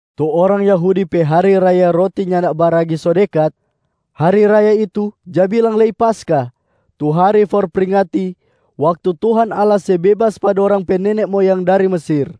Tu orang Yahudi pe hari raya Roti Nyanda Baragi so dekat. Hari raya itu ja bilang lei Paskah tu hari for pringati waktu Tuhan Allah se bebas pa dorang pe nene moyang dari Mesir.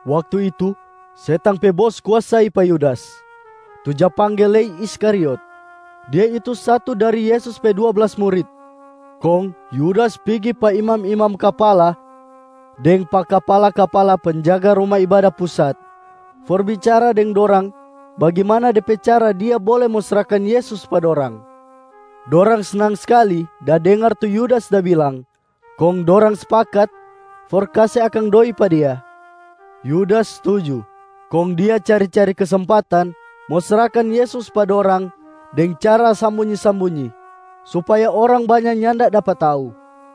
Waktu itu setang pe bos kuasai pa Yudas, tu ja pangge lei Iskariot. Dia itu satu dari Yesus pe dua blas murit. Kong Yudas pigi pa imam-imam kapala deng pa kapala-kapala penjaga Ruma Ibada Pusat for bicara deng dorang bagimana de pe cara dia bole mo srahkan Yesus pa dorang. Dorang snang skali da dengar tu Yudas da bilang kong dorang spakat for kase akang doi pa dia. Yudas stuju, kong dia cari-cari kesempatan mo srahkan Yesus pa dorang deng cara sambunyi-sambunyi, supaya orang banya nyanda dapa tau.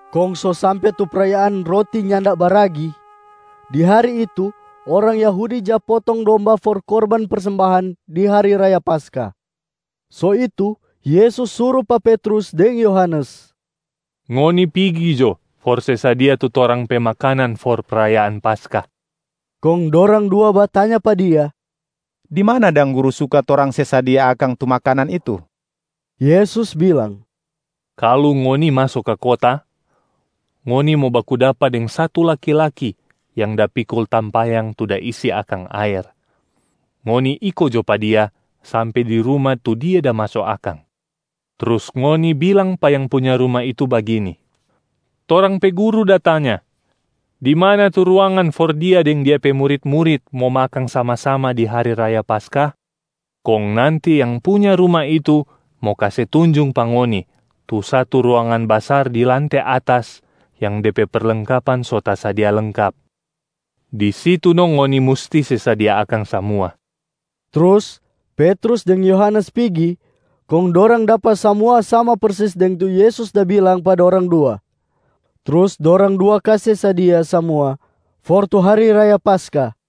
Kong so sampe tu prayaan Roti Nyanda Baragi, di hari itu orang Yahudi ja potong domba for korban persembahan di hari raya Paskah. So itu Yesus suru pa Petrus deng Yohanes, “Ngoni pigi jo for se sadia tu torang pe makanan for prayaan Paskah.” Kong dorang dua batanya pa Dia, “Di mana dang Guru suka torang se sadia akang tu makanan itu?” Yesus bilang, “Kalu ngoni maso ka kota, ngoni mo baku dapa deng satu laki-laki yang da pikul tampayang tu da isi akang aer. Ngoni iko jo pa dia sampe di ruma tu dia da maso akang. Trus ngoni bilang pa yang punya ruma itu bagini, ‘Torang pe Guru da tanya, di mana tu ruangan for Dia deng Dia pe murit-murit mo makang sama-sama di hari raya Paskah?’ Kong nanti yang punya ruma itu mo kase tunjung pa ngoni tu satu ruangan basar di lante atas yang de pe perlengkapan so tasadia lengkap. Di situ no ngoni musti se sadia akang samua.” Trus Petrus deng Yohanes pigi kong dorang dapa samua sama persis deng tu Yesus da bilang pa dorang dua. Trus dorang dua kase sadia samua for tu hari raya Paskah.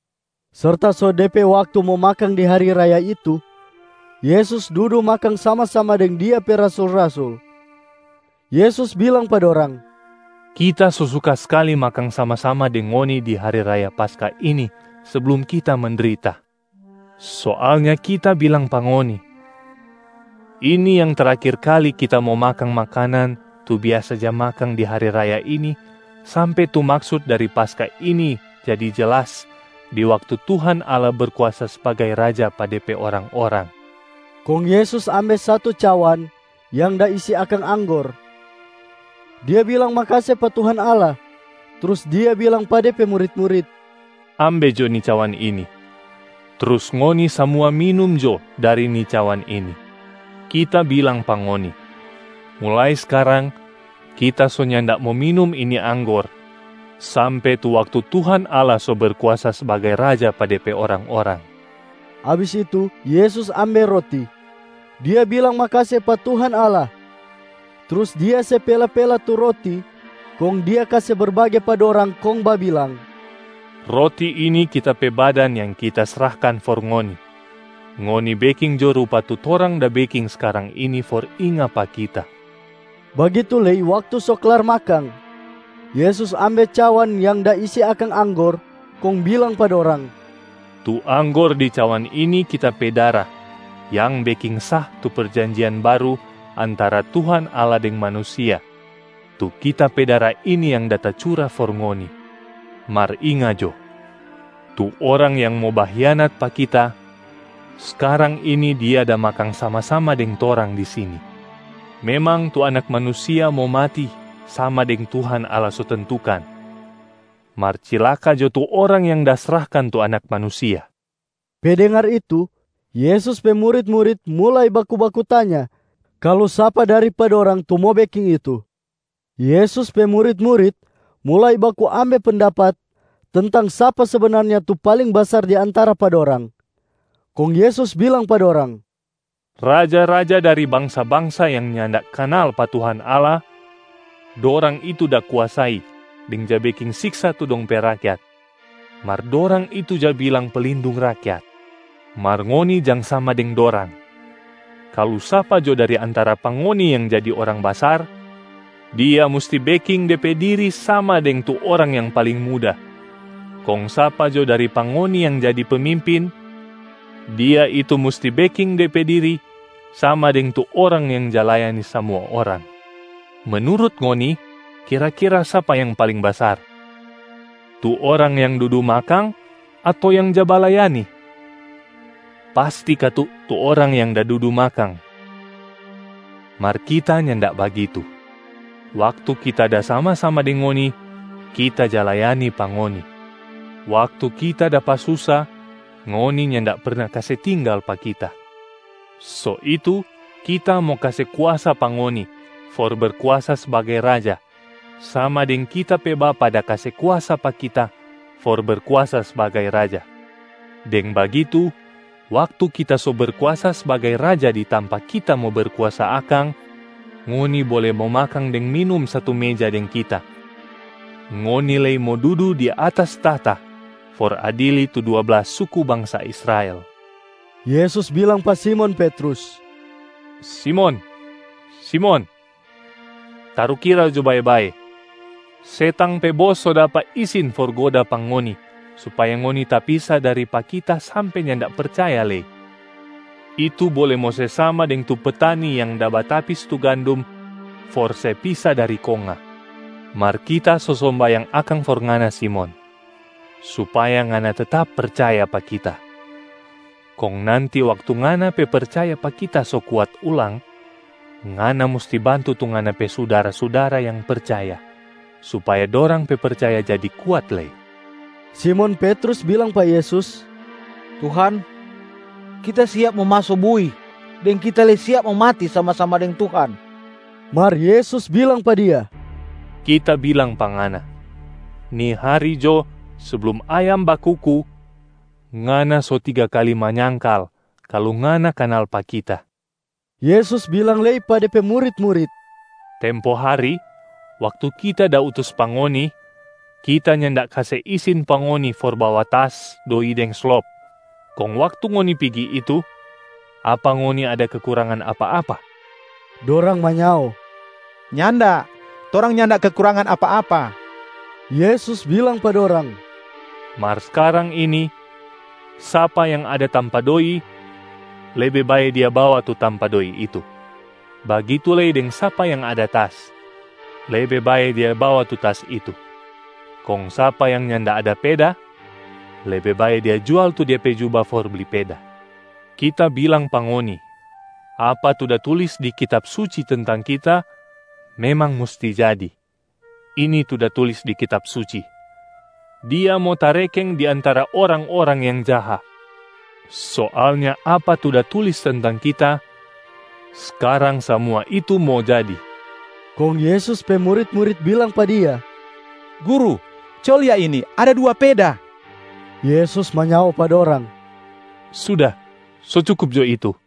Serta so de pe waktu mo makang di hari raya itu, Yesus dudu makang sama-sama deng Dia pe rasul-rasul. Yesus bilang pa dorang, “Kita so suka skali makang sama-sama deng ngoni di hari raya Paskah ini seblum Kita mendrita. Soalnya Kita bilang pa ngoni, ini yang terakhir kali Kita mo makang makanan tu biasa ja makang di hari raya ini sampe tu maksut dari Paskah ini jadi jelas di waktu Tuhan Allah Berkuasa sbagai Raja pa De pe orang-orang.” Kong Yesus ambe satu cawan yang da isi akang anggor, Dia bilang makase pa Tuhan Allah, trus Dia bilang pa De pe murit-murit, “Ambe jo ni cawan ini, trus ngoni samua minum jo dari ni cawan ini. Kita bilang pa ngoni, mulai skarang Kita so nyanda mo minum ini anggor sampe tu waktu Tuhan Allah so Berkuasa sbagai Raja pa De pe orang-orang.” Abis itu Yesus ambe roti, Dia bilang makase pa Tuhan Allah. Trus Dia se pela-pela tu roti kong Dia kase berbage pa dorang kong babilang, “Roti ini Kita pe badan yang Kita srahkan for ngoni. Ngoni beking jo rupa tu torang da beking skarang ini for inga pa Kita.” Bagitu lei waktu so klar makang, Yesus ambe cawan yang da isi akang anggor kong bilang pa dorang, “Tu anggor di cawan ini Kita pe dara yang beking sah tu Perjanjian Baru antara Tuhan Allah deng manusia, tu Kita pe dara ini yang da tacura for ngoni. Mar inga jo, tu orang yang mo bahianat pa Kita, skarang ini dia da makang sama-sama deng torang di sini. Memang tu Anak Manusia mo mati sama deng Tuhan Allah so tentukan, mar cilaka jo tu orang yang da srahkan tu Anak Manusia.” Pe dengar itu, Yesus pe murit-murit mulai baku-baku tanya kalu sapa dari pa dorang tu mo beking itu. Yesus pe murit-murit mulai baku ambe pendapat tentang sapa sebenarnya tu paling basar di antara pa dorang. Kong Yesus bilang pa dorang, “Raja-raja dari bangsa-bangsa yang nyanda kanal pa Tuhan Allah, dorang itu da kuasai deng ja beking siksa tu dong pe rakyat, mar dorang itu ja bilang ‘pelindung rakyat’. Mar ngoni jang sama deng dorang, kalu sapa jo dari antara pa ngoni yang jadi orang basar, dia musti beking de pe diri sama deng tu orang yang paling muda. Kong sapa jo dari pa ngoni yang jadi pemimpin, dia itu musti beking de pe diri sama deng tu orang yang ja layani samua orang. Menurut ngoni kira-kira sapa yang paling basar, tu orang yang dudu makang ato yang ja balayani? Pasti katu tu orang yang da dudu makang. Mar Kita nyanda bagitu, waktu Kita da sama-sama deng ngoni, Kita ja layani pa ngoni. Waktu Kita dapa susa, ngoni nyanda perna kase tinggal pa Kita. So itu Kita mo kase kuasa pa ngoni for berkuasa sbagai raja sama deng Kita pe Bapa da kase kuasa pa Kita for Berkuasa sbagai Raja. Deng bagitu, waktu Kita so Berkuasa sbagai Raja di tampa Kita mo berkuasa akang, ngoni bole mo makang deng minum satu meja deng Kita. Ngoni lei mo dudu di atas tahta for adili tu dua blas suku bangsa Israel.” Yesus bilang pa Simon Petrus, “Simon, Simon, tarukira jo bae-bae, setang pe bos so dapa isin for goda pa ngoni supaya ngoni tapisa dari pa Kita sampe nyanda percaya lei. Itu bole mo se sama deng tu petani yang da batapis tu gandum for se pisa dari konga. Mar Kita so sombayang akang for ngana Simon, supaya ngana tetap percaya pa Kita. Kong nanti waktu ngana pe percaya pa Kita so kuat ulang, ngana musti bantu tu ngana pe sudara-sudara yang percaya supaya dorang pe percaya jadi kuat lei.” Simon Petrus bilang pa Yesus, “Tuhan, kita siap mo maso bui deng kita lei siap mo mati sama-sama deng Tuhan!” Mar Yesus bilang pa dia, “Kita bilang pa ngana, ni hari jo seblum ayam bakuku, ngana so tiga kali manyangkal kalu ngana kanal pa Kita.” Yesus bilang lei pa De pe murit-murit, “Tempo hari, waktu Kita da utus pa ngoni, Kita nyanda kase isin pa ngoni for bawa tas, doi deng slop. Kong waktu ngoni pigi itu, apa ngoni ada kekurangan apa-apa?” Dorang manyao, “Nyanda, torang nyanda kekurangan apa-apa.” Yesus bilang pa dorang, “Mar skarang ini, sapa yang ada tampa doi, lebe bae dia bawa tu tampa doi itu, bagitu lei deng sapa yang ada tas, lebe bae dia bawa tu tas itu. Kong sapa yang nyanda ada peda, lebe bae dia jual tu dia pe juba for bli peda. Kita bilang pa ngoni apa tu da tulis di Kitab Suci tentang Kita memang musti jadi. Ini tu da tulis di Kitab Suci, ‘Dia mo tarekeng di antara orang-orang yang jaha.’ Soalnya apa tu da tulis tentang Kita, skarang samua itu mo jadi.” Kong Yesus pe murit-murit bilang pa Dia, “Guru, co lia ini, ada dua peda.” Yesus manyao pa dorang, “Suda, so cukup jo itu.”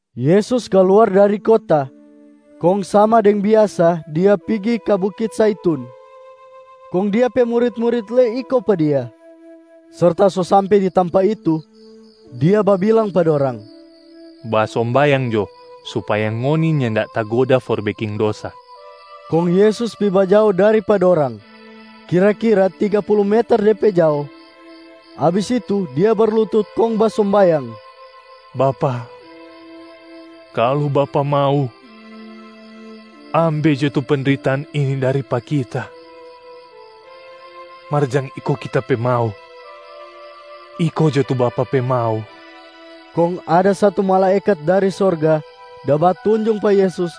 Yesus kaluar dari kota, kong sama deng biasa Dia pigi ka Bukit Zaitun, kong Dia pe murit-murit lei iko pa Dia. Serta so sampe di tampa itu, Dia babilang pa dorang, “Basombayang jo supaya ngoni nyanda tagoda for beking dosa.” Kong Yesus pi bajao dari pa dorang kira-kira tiga pulu meter de pe jao. Abis itu Dia berlutut kong basombayang, “Bapa, kalu Bapa mau, ambe jo tu pendritaan ini dari pa Kita. Mar jang iko Kita pe mau, iko jo tu Bapa pe mau.” [Kong ada satu malaekat dari sorga da batunjung pa Yesus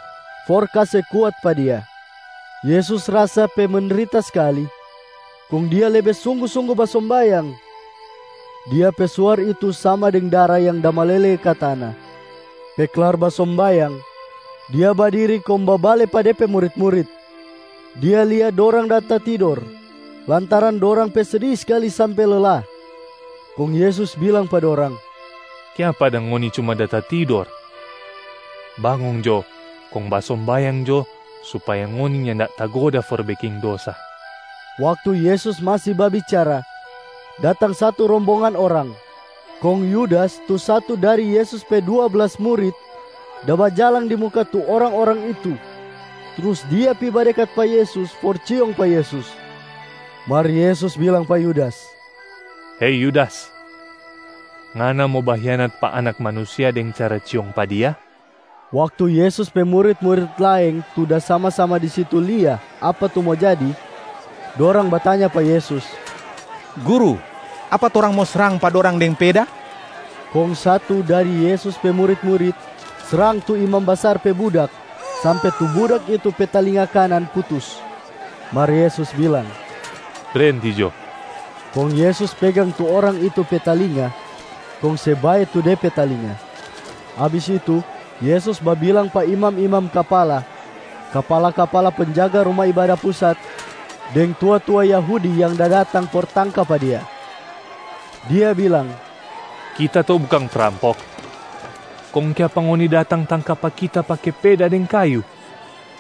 for kase kuat pa Dia. Yesus rasa pe mendrita skali kong Dia lebe sunggu-sunggu basombayang. Dia pe suar itu sama deng dara yang da malele ka tana.] Pe klar basombayang, Dia badiri kong babale pa De pe murit-murit. Dia lia dorang da tatidor lantaran dorang pe sedi skali sampe lela. Kong Yesus bilang pa dorang, “Kiapa dang ngoni cuma da tatidor? Bangong jo kong basombayang jo supaya ngoni nyanda tagoda for beking dosa.” Waktu Yesus masi babicara, datang satu rombongan orang, kong Yudas tu satu dari Yesus pe dua blas murit da bajalang di muka tu orang-orang itu. Trus dia pi badekat pa Yesus for ciong pa Yesus. Mar Yesus bilang pa Yudas, “Hei Yudas, ngana mo bahianat pa Anak Manusia deng cara ciong pa Dia?” Waktu Yesus pe murit-murit laeng tu da sama-sama di situ lia apa tu mo jadi, dorang batanya pa Yesus, “Guru, apa torang mo srang pa dorang deng peda?” Kong satu dari Yesus pe murit-murit srang tu imam basar pe budak sampe tu budak itu pe talinga kanan putus. Mar Yesus bilang, “Brenti jo!” Kong Yesus pegang tu orang itu pe talinga kong se bae tu de pe talinga. Abis itu Yesus babilang pa imam-imam kapala, kapala-kapala penjaga Ruma Ibada Pusat deng tua-tua Yahudi yang da datang for tangka pa Dia. Dia bilang, “Kita to bukang prampok, kong kiapa ngoni datang tangka pa Kita pake peda deng kayu?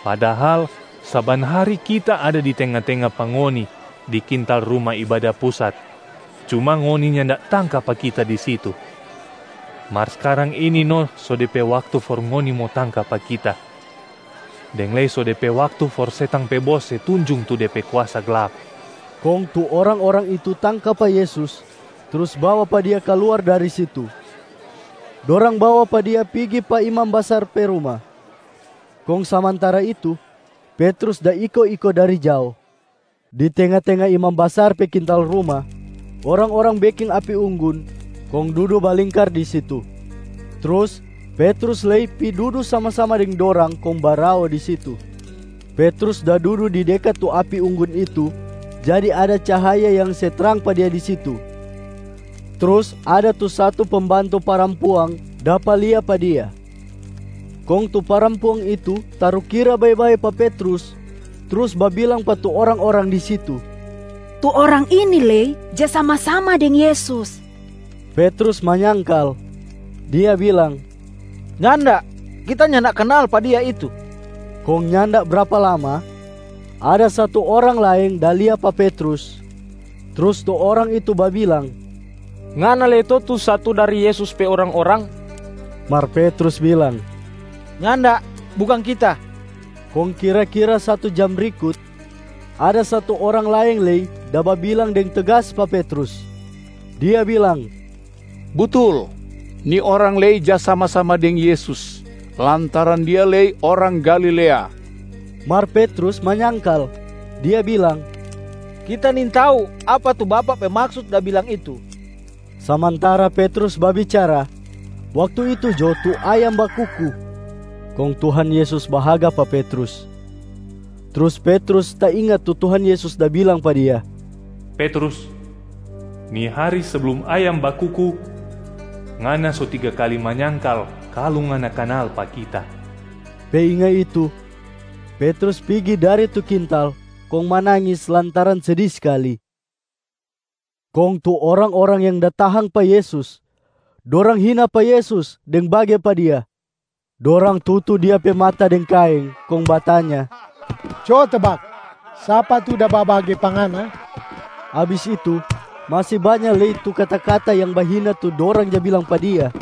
Padahal saban hari Kita ada di tenga-tenga pa ngoni di kintal Ruma Ibada Pusat, cuma ngoni nyanda tangka pa Kita di situ. Mar skarang ini no so de pe waktu for ngoni mo tangka pa Kita, deng lei so de pe waktu for setang pe bos se tunjung tu de pe kuasa glap.” Kong tu orang-orang itu tangka pa Yesus trus bawa pa Dia kaluar dari situ. Dorang bawa pa Dia pigi pa imam basar pe ruma, kong samantara itu, Petrus da iko-iko dari jao. Di tenga-tenga imam basar pe kintal ruma, orang-orang beking api unggun kong dudu balingkar di situ. Trus Petrus lei pi dudu sama-sama deng dorang kong barao di situ. Petrus da dudu di dekat tu api unggun itu jadi ada cahaya yang se trang pa dia di situ. Trus ada tu satu pembantu parampuang dapa lia pa dia. Kong tu parampuang itu tarukira bae-bae pa Petrus trus babilang pa tu orang-orang di situ, “Tu orang ini lei ja sama-sama deng Yesus!” Petrus manyangkal, dia bilang, “Nyanda, Kita nyanda kanal pa Dia itu!” Kong nyanda brapa lama, ada satu orang laeng da lia pa Petrus. Trus tu orang itu babilang, “Ngana lei to tu satu dari Yesus pe orang-orang!” Mar Petrus bilang, “Nyanda, bukang kita.” Kong kira-kira satu jam brikut, ada satu orang laeng lei da babilang deng tegas pa Petrus. Dia bilang, “Butul, ni orang lei ja sama-sama deng Yesus, lantaran dia lei orang Galilea.” Mar Petrus manyangkal, dia bilang, “Kita nintau apa tu bapak pe maksut da bilang itu.” Samantara Petrus babicara, waktu itu jo tu ayam bakuku. Kong Tuhan Yesus bahaga pa Petrus. Trus Petrus tainga tu Tuhan Yesus da bilang pa dia, “Petrus, ni hari seblum ayam bakuku, ngana so tiga kali manyangkal kalu ngana kanal pa Kita.” Pe inga itu, Petrus pigi dari tu kintal kong manangis lantaran sedi skali. Kong tu orang-orang yang da tahang pa Yesus, dorang hina pa Yesus deng bage pa Dia. Dorang tutu Dia pe mata deng kaeng kong batanya, “Co tebak, sapa tu da babage pa Ngana?” Abis itu masi banya lei tu kata-kata yang bahina tu dorang ja bilang pa Dia.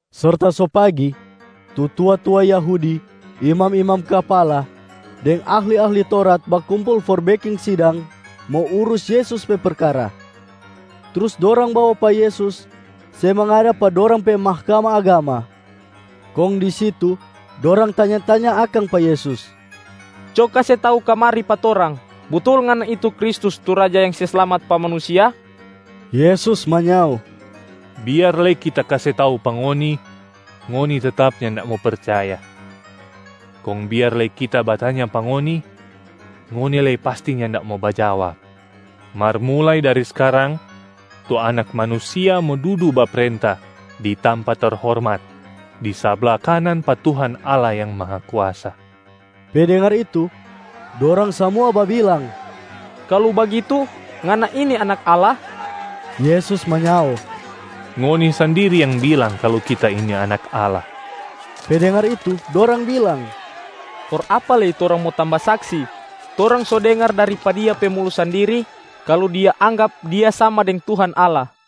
Serta so pagi, tu tua-tua Yahudi, imam-imam kapala deng ahli-ahli Taurat bakumpul for beking sidang mo urus Yesus pe perkara. Trus dorang bawa pa Yesus se mangada pa dorang pe Mahkamah Agama, kong di situ dorang tanya-tanya akang pa Yesus, “Co kase tau kamari pa torang, butul Ngana itu Kristus tu Raja yang se slamat pa manusia?” Yesus manyao, “Biar lei Kita kase tau pa ngoni, ngoni tetap nyanda mo percaya. Kong biar lei Kita batanya pa ngoni, ngoni lei pasti nyanda mo bajawab. Mar mulai dari skarang tu Anak Manusia mo dudu baprenta di tampa terhormat di sabla kanan pa Tuhan Allah Yang Mahakuasa.” Pe dengar itu, dorang samua babilang, “Kalu bagitu, Ngana ini Anak Allah?” Yesus manyao, “Ngoni sandiri yang bilang kalu Kita ini Anak Allah.” Pe dengar itu, dorang bilang, “For apa lei torang mo tamba saksi? Torang so dengar dari pa Dia pe mulu sandiri kalu Dia anggap Dia sama deng Tuhan Allah.”